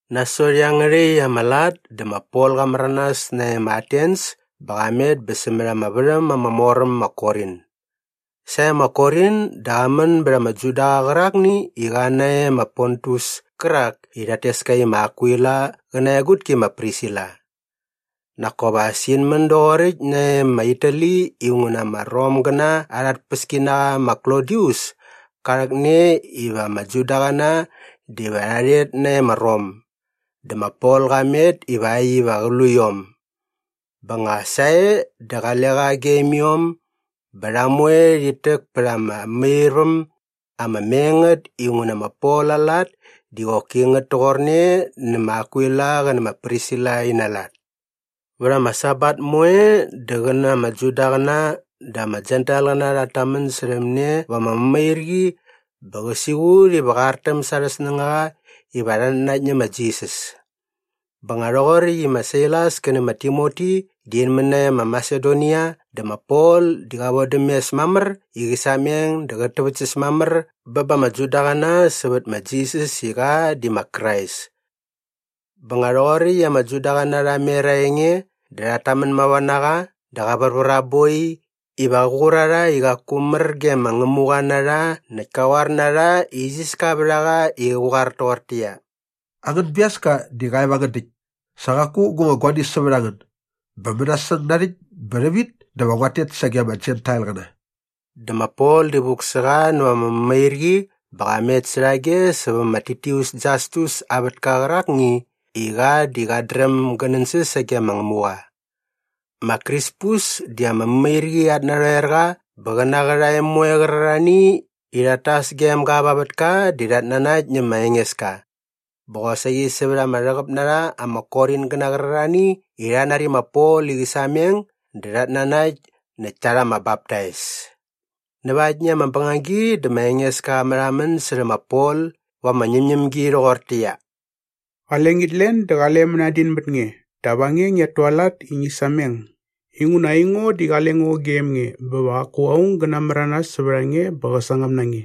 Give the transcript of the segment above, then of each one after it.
Nasot iangärhäkt ama lat dä ma Pol qa märanas nae ma Atens bä qa met bä sämät ama värhäm ama mor äm ma Korin. Sae ma Korin dä qa män bät ama Judaqa qärakni i qa nae ma Pontus kärak i rhat tes ka i ma Akwila qä na aa egutki ma Prisila. Nak kop as in män doqoräkt nae ma Itali inguna ama Romgäna arha tpäskinaqa ma Klodius ka rhäkne iva ama Judaqäna diva rha rhet nae ma Rom. Dä ma Pol qa met ivakt iva qä lu iom bä nga sae dä qale qa gem iom bä rha moe rhit täk pät ama mämairväm ama me ngät inguna ma Pol aa lat di qoki ngät toqorne nä ma Akwila qä nä ma Prisila ina lat. Vät ama Sabat moe dä qä na ama Judaqäna dä ama Jentailqäna rhat tamän särhäm ne va ama mämairqi bä qä siqut iva qä artäm sa arhä snängaqa iva rhat nanakt nä ma Jisas. Bä nga rhoqoräkt i ma Sailas kä nä ma Timoti di in män nae ma Masedonia dä ma Pol di qa vodäm mes mamär i qä sameng dä qät täväktsäs mamär bä ba ama Judaqäna sävät ma Jisas i qa di ma Krais. Bä nga rhoqoräkt i ama Judaqäna rha mer aa enge dä rhat tamän mava na qa dä qa värvär aa boi iva qä qur a rha i qaku mär ge ma Ngämuqa na rha näkt ka qoar na rha i isiska vät a qa i qä qoar toqortäqyia, “Angän biaska di qa e va angän däkt. Sa qaku gu nga guani sävät a ngän. Bä mänasäng narhäkt bä rhävit dä va nguat tet sage ama Jentailqäna.” Dä ma Pol di vuk sä qa näva ama mämairqi bä qa met särhage sävä ma Titius Jastus aa vätka qärakni i qa di qat dräm gä nänsäs sage ma Ngämuqa. Ma Krispus di ama mämairqi at narhoerqa bä qä na aa qärhae moe qärarhani i rhat tas gem ga va aa vätka di rhat nanakt nä ma Engeska. Bä qosaqi sävät ama rhäqäp na rha ama Koringäna qärarhani i rha nari ma Pol i qä sameng dä rhat nanakt näkt ta rha ama baptais. Näva aktni ama bängagi dä ma Engeska qa märhamän särhä ma Pol va ama ñämñämgi rhoqortäqyia, “Qale ngit len dä qale mänadin mät nge dap a nge ngiat tualat i ngi sameng inguna aingo di qale ngo gem nge bä va qaku aung gä namäranas sävät a nge bä qä sangäm na nge.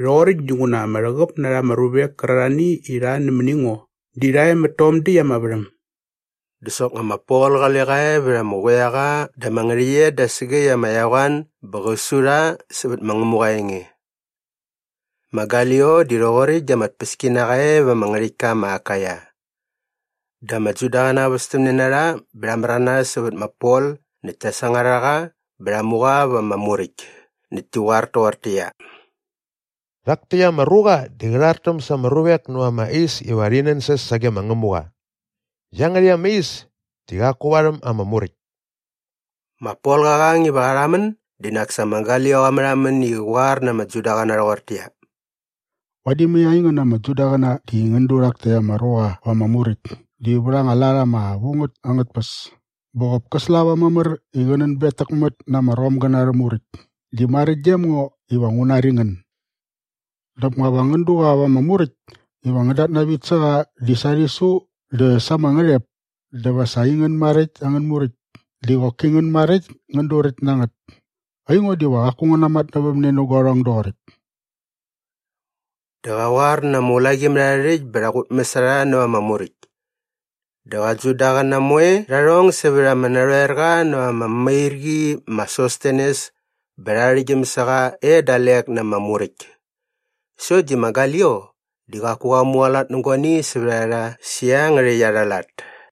Rhoqoräkt dinguna ama rhäqäp na rha ama ruvek kärarhani i rha nämäni ngo di rha e mät tom däkt ama värhäm.” Dä soknga ma Pol qale qa e vät ama quiaqa dä ama ngärhäqyet da sägäkt ama eqoan bä qä su rha sävät ma Ngämuqa aa enge. Ma Galio di rhoqoräkt di ama tpäskinaqa e va ama ngärhäktka ma Akaia. Dä ama Judaqäna västämne na rha bä rha märanas sävät ma Pol näkt ta sangar a qa bä rha mu qa va ama muräkt näkt ti qoar toqortäqyia, “Rhak täkt ama ruqa di qä rhartäm sa ama ruvek näva ama is iva rhi nänsäs sage ma Ngämuqa. Iangärhäkt ama is di qaku varhäm ama Muräkt.” Ma Pol qa qang iva qa rhamän di nak sa ma Galio qa märhamän i qä qoar na ama Judaqäna rhoqortäqyia, “Vadi mai aingän ama Judaqäna di ngän du rhak täkt ama ruqa va ama muräkt di vät anga lat ama vu ngät angät tpäs bä qop kä slava mamär i qä nänbetäkmät na ama Romgäna arhä muräkt di maräkt gem ngo iva ngu nari ngän. Dap nga va ngän du qa va ama muräkt iva ngän datnavit sä qa di sa aa rhisu dä sa ama ngärhep dä va sa aingän maräkt angän Muräkt di qoki ngän maräkt ngän duräkt na ngät. Aingo diva qaku ngu natmatnävämne nä guarhong doqoräkt.” Dä qa qoar na ama ulaqimärharhärhäkt bä rha qutmäs a rha näva ama muräkt. Dä qä Judaqäna moe rha rhong sävät ama narhoerqa näva ama mämairqi ma Sostenes bä rha arhäktgyäm sä qa e dalek na ama muräkt. Sokt di ma Galio di qaku qa mualat nä guani sävät a rha sä iangärhäkt arha lat.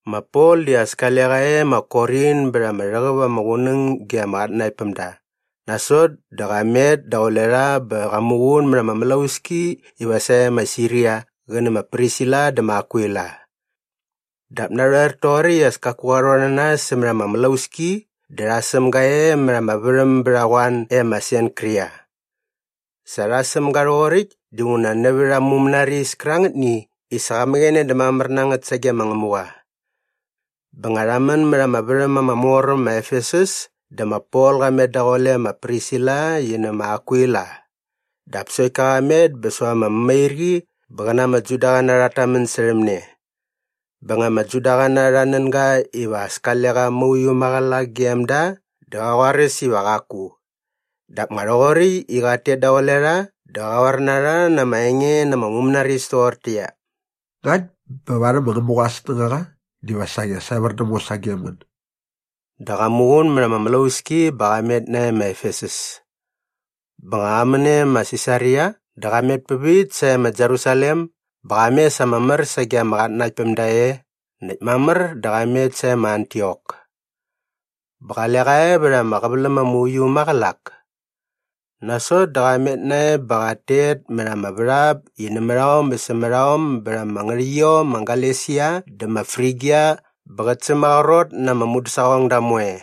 Ma Pol di as kale qa e ma Korin bät ama rhäqäp ama qunäng ge ama qatnanaktpämda. Nasot dä qa met daqule rha bä qa muqun mät ama mlauski iva sae ma Siria qä nä ma Prisila dä ma Akwila. Dap narhoer toqoräkt i as kaku qa rhon na nas sämät ama mlauski dä rha säm ga e mät ama värhäm bät a qoan e ma Senkria. Sa rha säm ga rhoqoräkt dinguna nävät aa mumänaris kärangätni i sa qa mäqäne dä mamär na ngät sage ma Ngämuqa. Bä nga rha män mät ama värhäm ama mor äm ma Efesus dä ma Pol qa met daqule ma Prisila qi nä ma Akwila. Dap sokt ka qa met bä säva ama mämairqi bä qä na ama Judaqäna rhat tamän särhäm ne. Bä nga ama Judaqäna rha nän ga iva as kale qa mauiu maqälak gem da dä qa qoaräs iva qaku. Dap nga rhoqoräkt i qat tet daqule rha dä qa qoar na rha na ama enge na ama mumänaris toqortäqyia, “Ngakt bä varhäm ma Ngämuqa aa snängaqa diva saqi as evär däm ngo sagem ngän.” Dä qa muqun mät ama mlauski bä qa met nae ma Efesus. Bä nga qa män e ma Sisaria dä qa met pävit sae ma Jerusalem bä qa mes ama mär sage ama qatnanaktpämda e näkt mamär dä qa met sae ma Antiok. Bä qale qa e vät ama qäväläm ama uiu äm maqälak. Nasot dä qa met nae bä qat tet mät ama värhap i nämät aom bä sämät aom bät ama ngärhäqyiom ma Galesia dä ma Frigia bä qät sämaqrot na ama mudäsaqongda moe.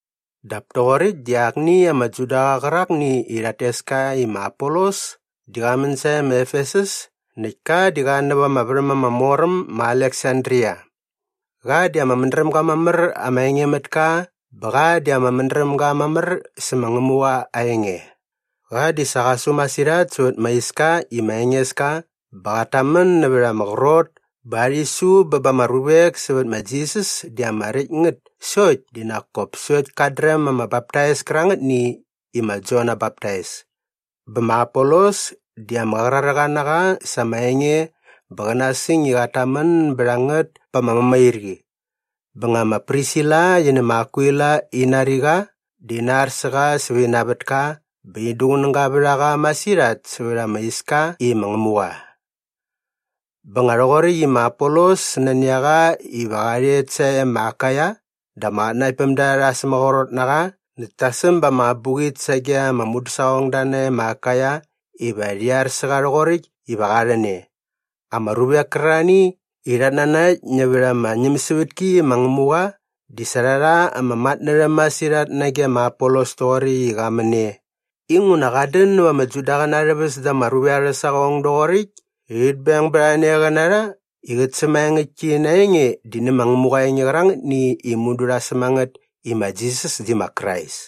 Dap toqoräkt di akni ama Judaqa qärakni i rhat tes ka i ma Apolos di qa män sae ma Efesus näkt ka di qa näva ama värhäm ama mor äm ma Aleksandria. Qa di ama mädrämga mamär ama engemätka bä qa di ama mädrämga mamär sä ma Ngämuqa aa enge. Qa di sa qa su masirhat sävät ma Iska i ma Engeska bä qat tamän nävät ama qrot bä aa rhisu bä ba ama ruvek sävät ma Jisas di ama räkt ngät sokt di nak kop sokt kat dräm ama baptais kärangätni i ma Jon aa baptais. Bä ma Apolos di ama qraräqa na qa sa ama enge bä qä nasäng i qat tamän bät a ngät pa ama mämairqi. Bä nga ma Prisila qi nä ma Akwila in nari qa dä ina ar sä qa sävä ina vätka bä in duqunäga vät a qa masirhat sävät ama iska i ma Ngämuqa. Bä nga rhoqoräkt i ma Apolos nani a qa iva qa rhet sae ma Akaia dä ama qatnanaktpämda rha sämaqrot na qa näkt ta säm ba ama abuqit sage ama mudäsaqongda nae ma Akaia iva rhi ar sä qa rhoqoräkt iva qa rhän e. Ama ruvek kärarhani i rhat nanakt nävät ama ñämsävätki i ma Ngämuqa di sa rha rha ama matnärhäm masirhat nage ma Apolos toqoräkt i qa män e inguna qat dän näva ama Judaqäna arhä väs da ama ruvek arhä saqong doqoräkt i rhit beng bät a ne qä na rha i qät sämaengäktki na aa enge di nä ma Ngämuqa aa enge qärangätni i mudu rha säm a ngät i ma Jisas di ma Krais.